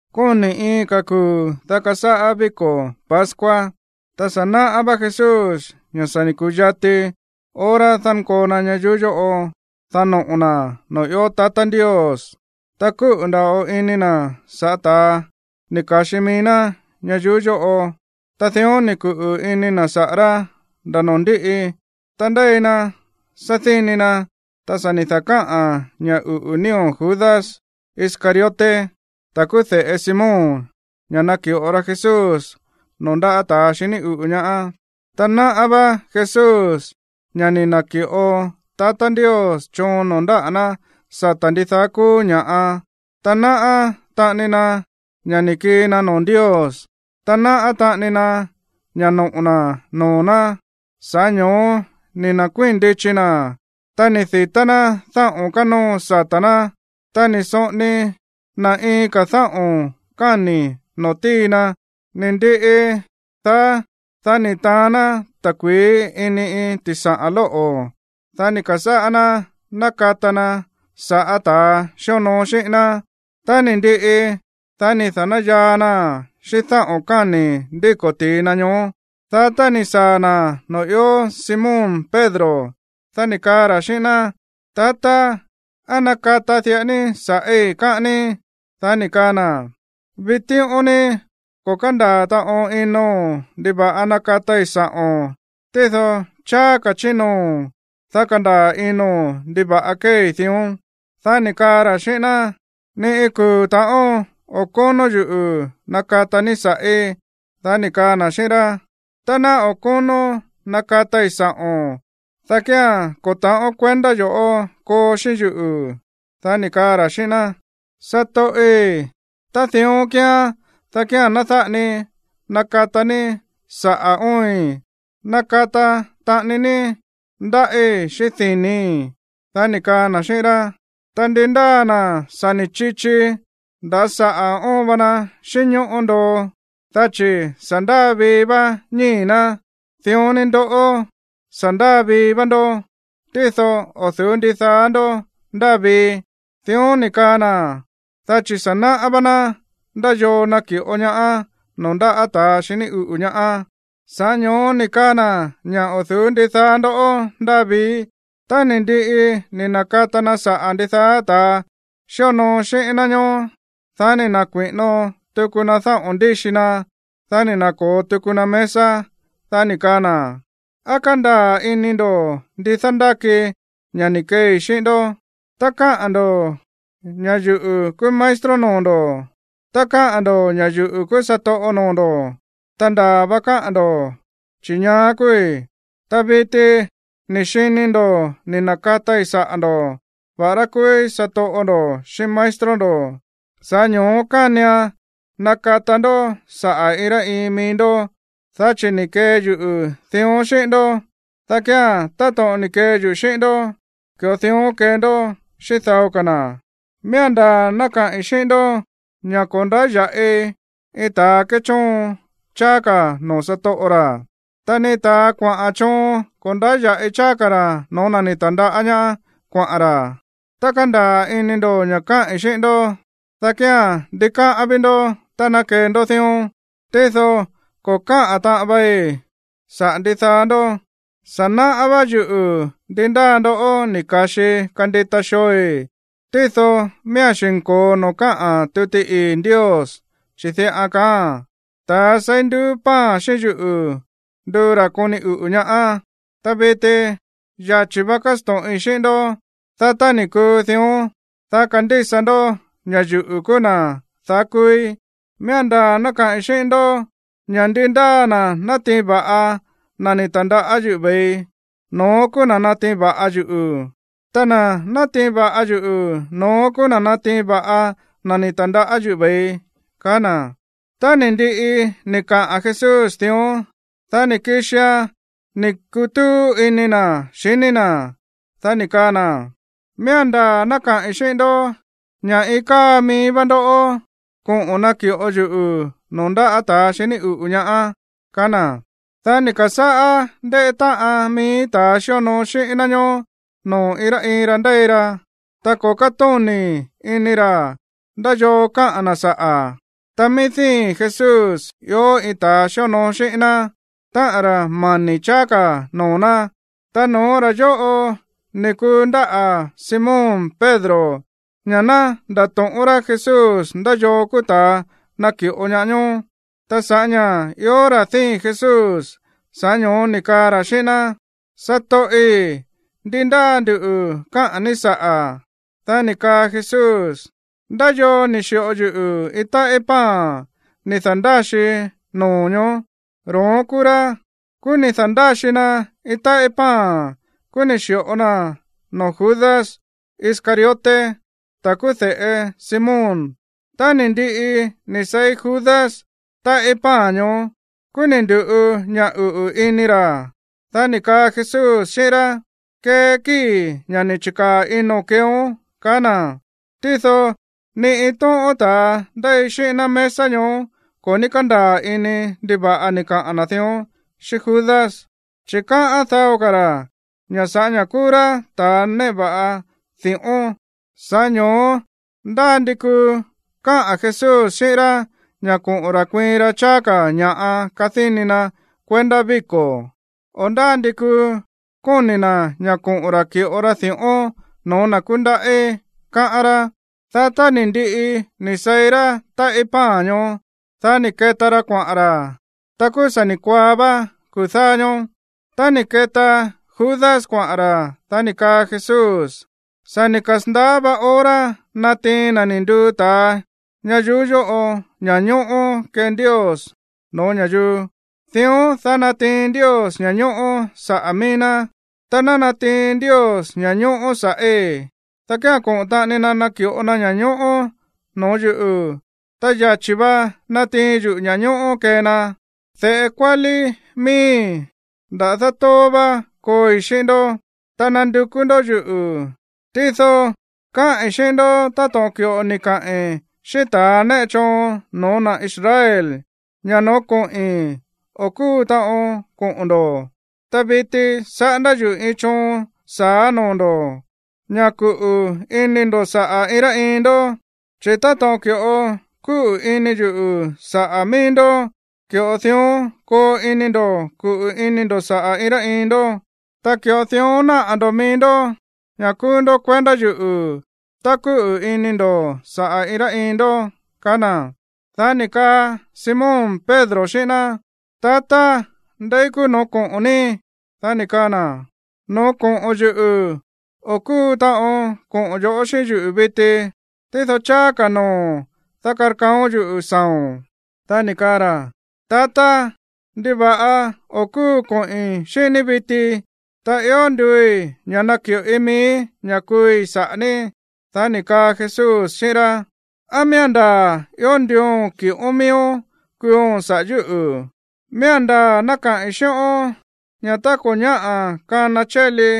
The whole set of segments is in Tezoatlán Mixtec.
Kóni̱ iin ka̱ kuu̱ dá kasáꞌá víko̱ pascua. Ta sa̱ naꞌá vá Jesús ña̱ sa̱ ni̱ ku̱yati hora dánkoo na ñayuú yóꞌo, dá noꞌo̱ na̱ noo̱ ió tatá Ndios. Ta kúꞌu̱ nda̱ꞌo ini na̱ sa̱ꞌá ta̱a ni̱ ka̱xi mií ná ñayuú yóꞌo, ta dión ni̱ kuꞌu̱ ini na̱ saꞌa̱ rá nda̱ noo̱ ndíꞌi. Ta ndéi na sádíni na̱, ta sa̱ ni̱ da̱káꞌa̱n ña̱ uꞌu̱ nío̱ Judas Iscariote, ta̱ kúú de̱ꞌe Simón, ña̱ naki̱ꞌo ra Jesús noo̱ ndáꞌa̱ ta̱ xiní uꞌu̱ ñaá. Ta náꞌá vá Jesús ña̱ ni̱ na̱ki̱ꞌo tatá Ndios choon noo̱ ndáꞌa̱ ná sata̱ ndidaá kúú ña̱ꞌa, ta náꞌá taꞌani na ña̱ ni̱ kii na noo̱ Ndios, ta náꞌá taꞌani na ña̱ noꞌo̱ na̱ noo̱ ná, sa̱ꞌá ño̱ó ni̱ na̱kuíi̱n ndichi na̱, ta ni̱ di̱tá ná dáꞌo̱n kánóo sata̱ ná, ta ni̱ soꞌoni na̱ iin ka̱ dáꞌo̱n káni̱ no̱ó ti̱i na. Ni̱ ndiꞌi daá, dá ni̱ taán ná ta̱kui̱í ini iin ti̱saꞌa̱n lóꞌo̱, dá ni̱ ka̱sáꞌá ná nákata na sa̱ꞌá ta̱ xíonoo xíꞌín ná. Tá ni̱ ndiꞌi, dá ni̱ na̱dáyaa naa̱n xíꞌín dáꞌo̱n káni̱ ndíko̱ ti̱i na ñoó. Dá tá ni̱ saa̱ na̱ noo̱ ió Simón Pedro, dá ni̱ kaa ra̱ xíꞌín ná: ―Tatá, ¿á nakata diꞌa ní sa̱ꞌí, káꞌán ní? Dá ni̱ kaa na̱: ―Vitíꞌón ní ko̱ kándaa̱ taꞌon ino̱n ndiva̱ꞌa nákatai sa̱ꞌo̱n, tído cháá ka̱ chí noo̱, dá kandaa̱ ino̱n ndiva̱ꞌa kéei dión. Dá ni̱ kaa ra̱ xíꞌín ná: ―Ni iin kuu̱ ta̱ꞌón o̱ kónó yuꞌu̱ nakata ní sa̱ꞌí. Dá ni̱ kaa na̱ xíꞌín rá: ―Tá ná o̱ kónón nakatai sa̱ꞌo̱n, dá kía̱n ko̱ ta̱ꞌón kuendá yo̱ꞌó koo xíꞌín yuꞌu̱. Dá ni̱ kaa ra̱ xíꞌín ná: ―Satoꞌi̱, tá dión kíán, dá kía̱n ná dáꞌa ni nakata ní saꞌa̱ óoin, nakata taꞌani ní ndáꞌí xíꞌín dini̱í. Dá ni̱ kaa na̱ xíꞌín rá: ―Ta ndi ndáa na̱ sa̱ ni̱ chichi, nda̱ saꞌa̱ óon va na xínñóꞌó ndoo, dá chi̱ sa̱ ndáa vii vá ñíi̱ ná. Dión ni ndoꞌó, sa̱ ndáa vii vá ndó, tído o̱ du̱ú ndidaá ndó ndáa vii. Dión ni̱ kaa na̱, dá chi̱ sa̱ náꞌá vá ná ndá yoo naki̱ꞌo ñaá noo̱ ndáꞌa̱ ta̱ xiní uꞌu̱ ñaá, sa̱ꞌá ño̱ó ni̱ kaa na̱ ña̱: “O̱ du̱ú ndidaá ndó ndáa vii.” Tá ni̱ ndiꞌi ni̱ na̱kata na saꞌa̱ ndidaá ta̱ xíonoo xíꞌín ná ñoó, dá ni̱ na̱kui̱ꞌino tuku na dáꞌo̱n ndíxi na, dá ni̱ na̱ko̱o tuku na mesa, dá ni̱ kaa na̱: ―¿Á kándaa̱ ini ndo̱ ndi dándáki ña̱ ni̱ keei xíꞌín ndó? Káꞌa̱n ndo̱ ña̱ yuꞌu̱ kúú maestro noo̱ ndo̱, ta káꞌa̱n ndo̱ ña̱ yuꞌu̱ kúú satoꞌo noo̱ ndo̱. Ta ndaa̱ va káꞌa̱n ndo̱, chi̱ ñaá kúúí. Ta viti ni̱ xini ndo̱ ni̱ na̱katai saꞌa̱ ndo̱, va̱ꞌará kúúí satoꞌo ndo̱ xíꞌín maestro ndo̱. Sa̱ꞌá ño̱ó kánian nakata ndó saꞌa̱ iin rá iin mií ndó. Dá chi̱ ni̱ kee yuꞌu̱ dión xíꞌín ndó, dá kía̱n, táto̱ꞌon ni̱ kee yuꞌu̱ xíꞌín ndó, ki̱ꞌo dión kee ndó xíꞌín dao ka̱ na̱. Miía̱n ndaa̱ ná kaꞌi̱n xíꞌín ndó ña̱ ko̱ ndáya̱ꞌi iin ta̱ kéchóon cháá ka̱ noo̱ satoꞌo ra̱. Ta ni ta̱ kuaꞌa̱n choon ko̱ ndáya̱ꞌi cháá ka̱ ra̱ no̱ó na̱ ni̱ ta̱ndaꞌá ñaá kuaꞌa̱n ra̱. Tá kandaa̱ ini ndo̱ ña̱ káꞌi̱n xíꞌín ndó, dá kía̱n ndikáꞌán ví ndó tá ná kee ndó dión. ’Tído ko̱ káꞌa̱n taꞌon vei saꞌa̱ ndidaá ndó. Sa̱ náꞌá vá yuꞌu̱ ndi ndáa ndoꞌó ni̱ ka̱xii kandita xooi̱. Tído miía̱n xi̱nko̱o noo̱ káꞌa̱n tuti ii̱ Ndios, chi̱ diꞌa kaáa̱n: “Ta̱a seí nduú pan xíꞌín yuꞌu̱ nduu ra̱ koni uꞌu̱ ñaá.” Ta viti yachi̱ va kasto̱ꞌin xíꞌín ndó, dá tá ni̱ kuu dión, dá kandísa ndó ña̱ yuꞌu̱ kúú na̱ daá kúúí. Miía̱n ndaa̱ ná kaꞌi̱n xíꞌín ndó ña̱ ndi ndáa na̱ natiin va̱ꞌa iin na̱ tandaꞌá yuꞌu̱ ko̱saa̱, no̱ón kúú na̱ natiin va̱ꞌa yuꞌu̱. Ta na̱ natiin va̱ꞌa yuꞌu̱, no̱ón kúú na̱ natiin va̱ꞌa na̱ ni̱ ta̱ndaꞌá yuꞌu̱ ve̱ii ―kaá na̱. Ta ni̱ ndiꞌi ni̱ kaꞌa̱n Jesús dión, dá ni̱ kixia̱n ni̱ kutúú ini na̱ xiní na̱, dá ni̱ kaa na̱: ―Miía̱n ndaa̱ ná kaꞌi̱n xíꞌín ndó ña̱ iin káa mií vá ndoꞌó koꞌo̱n naki̱ꞌo yuꞌu̱ noo̱ ndáꞌa̱ ta̱ xiní uꞌu̱ ñaá ―kaá na̱. Dá ni̱ ka̱sáꞌá ndéꞌé táꞌan mií ta̱ xíonoo xíꞌín ná ñoó noo̱ iin rá iin ra ndéi ra, ta ko̱ kátóni̱ ini ra̱ ndá yoo káꞌa̱n na̱ saꞌa̱. Ta mií díi̱n Jesús ió iin ta̱ xíonoo xíꞌín ná, táꞌa̱n ra̱ mani̱ cháá ka̱ noo̱ ná. Ta no̱ó ra̱ yóꞌo ni̱ kundáꞌa̱ Simón Pedro, ña̱ ná ndato̱ꞌón rá Jesús ndá yoo kúú ta̱a naki̱ꞌo ñaá ñoó. Ta sa̱ꞌá ña̱ ió ra̱ díi̱n Jesús, sa̱ꞌá ño̱ó ni̱ kaa ra̱ xíꞌín ná: ―Satoꞌi̱, ¿ndi ndáa nduꞌu̱ káꞌa̱n ní saꞌa̱? Dá ni̱ kaa Jesús: ―Ndá yoo ni̱ xi̱ꞌo yuꞌu̱ iin táꞌí pan ni̱ da̱ndáxii noo̱ ñoó, ro̱ón kúú rá. Kúú ni̱ da̱ndáxi na iin táꞌí pan, kúú ni̱ xi̱ꞌo naa̱n noo̱ Judas Iscariote, ta̱ kúú de̱ꞌe Simón. Tá ni̱ ndiꞌi ni̱ seí Judas táꞌí pan ñoó, kúú ni̱ ndu̱ꞌu ña̱ uꞌu̱ ini ra̱. Dá ni̱ kaa Jesús xíꞌín rá: ―Kee kíi̱ ña̱ ni̱ chi̱kaa̱ ino̱n keeón ―kaá na̱. Tído ni iin tóꞌón ta̱ ndéi xíꞌín ná mesa ñoó ko̱ ní kándaa̱ ini ndiva̱ꞌa ni̱ kaꞌa̱n na̱ dión xíꞌín Judas. Chi̱ káꞌán dao ka̱ ra̱ ña̱ sa̱ꞌá ña̱ kúú rá ta̱ néꞌe va̱ꞌa di̱ꞌón, sa̱ꞌá ño̱ó ndá ndi kuu káꞌa̱n Jesús xíꞌín rá ña̱ koꞌo̱n ra̱ kuiin ra cháá ka̱ ña̱ꞌa kadíni na̱ kuendá víko̱, o ndá ndi kuu kóni̱ na̱ ña̱ koꞌo̱n ra̱ ki̱ꞌo ra di̱ꞌón no̱ó na̱ kúndaꞌí, káꞌán rá. Dá tá ni̱ ndiꞌi ni̱ seí rá táꞌí pan ñoó, dá ni̱ keta ra kuaꞌa̱n ra̱. Ta kúú sa̱ ni̱ kuaá vá kuu̱ dáá ñóó. Tá ni̱ keta Judas kuaꞌa̱n ra̱, dá ni̱ kaa Jesús: ―Sa̱ ni̱ kasa̱ndaá vá hora natiin na̱ ni̱ nduu ta̱a ñayuú yóꞌo ña̱ñóꞌó kee Ndios no̱ó ña̱yuu, dión dá natiin Ndios ña̱ñóꞌó saꞌa̱ mií ná. Tá ná natiin Ndios ña̱ñóꞌó sa̱ꞌí, dá kía̱n koꞌo̱n taꞌani na̱ naki̱ꞌo na ña̱ñóꞌó no̱ó yuꞌu̱, ta yachi̱ va natiin yuꞌu̱ ña̱ñóꞌó kee na. De̱ꞌe kuálí miíi̱, nda̱dá tóó vá kooi xíꞌín ndó. Ta nandukú ndó yuꞌu̱, tído káꞌi̱n xíꞌín ndó táto̱ꞌon ki̱ꞌo ni̱ kaꞌi̱n xíꞌín ta̱ néꞌe choon no̱ó na̱ Israel ña̱ no̱ó koꞌi̱n, o̱ kúu taꞌon koꞌo̱n ndo̱. Ta viti saꞌándá yuꞌu̱ iin choon sa̱á noo̱ ndo̱, ña̱ kuꞌu̱ ini ndo̱ saꞌa̱ iin rá iin ndó, chi̱ táto̱ꞌon ki̱ꞌo kúꞌu̱ ini yuꞌu̱ saꞌa̱ mií ndó, ki̱ꞌo dión koo ini ndo̱ kuꞌu̱ ini ndo̱ saꞌa̱ iin rá iin ndó. Ta ki̱ꞌo dión náꞌa̱ ndo̱ mií ndó ña̱ kúú ndó kuendá yuꞌu̱ tá kúꞌu̱ ini ndo̱ saꞌa̱ iin rá iin ndó ―kaá na̱. Dá ni̱ kaa Simón Pedro xíꞌín ná: ―Tatá, ¿ndeí kúú noo̱ koꞌo̱n ní? Dá ni̱ kaa na̱: ―No̱ó koꞌo̱n yuꞌu̱, o̱ kúu taꞌon koꞌo̱n yo̱ꞌó xíꞌín yuꞌu̱ viti. Tído cháá ka̱ noo̱, dá karkaaón yuꞌu̱ saa̱o̱n. Dá ni̱ kaa ra̱: ―Tatá, ¿ndiva̱ꞌa o̱ kúu koꞌi̱n xíꞌín ní viti? Ta ió nduui̱ ña̱ naki̱ꞌoi miíí ña̱ kuui̱ saꞌa̱ ní. Dá ni̱ kaa Jesús xíꞌín rá: ―¿Á miía̱n ndaa̱ ió nduuo̱n ki̱ꞌón miíón kuuo̱n saꞌa̱ yúꞌu̱? Miía̱n ndaa̱ ná kaꞌi̱n xíꞌón ña̱ tá ko̱ ñáꞌa̱ kana chéli,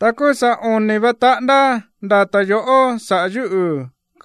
ta kúú sa̱ oni̱ va taꞌándá ndata̱ yo̱ꞌó saꞌa̱ yúꞌu̱.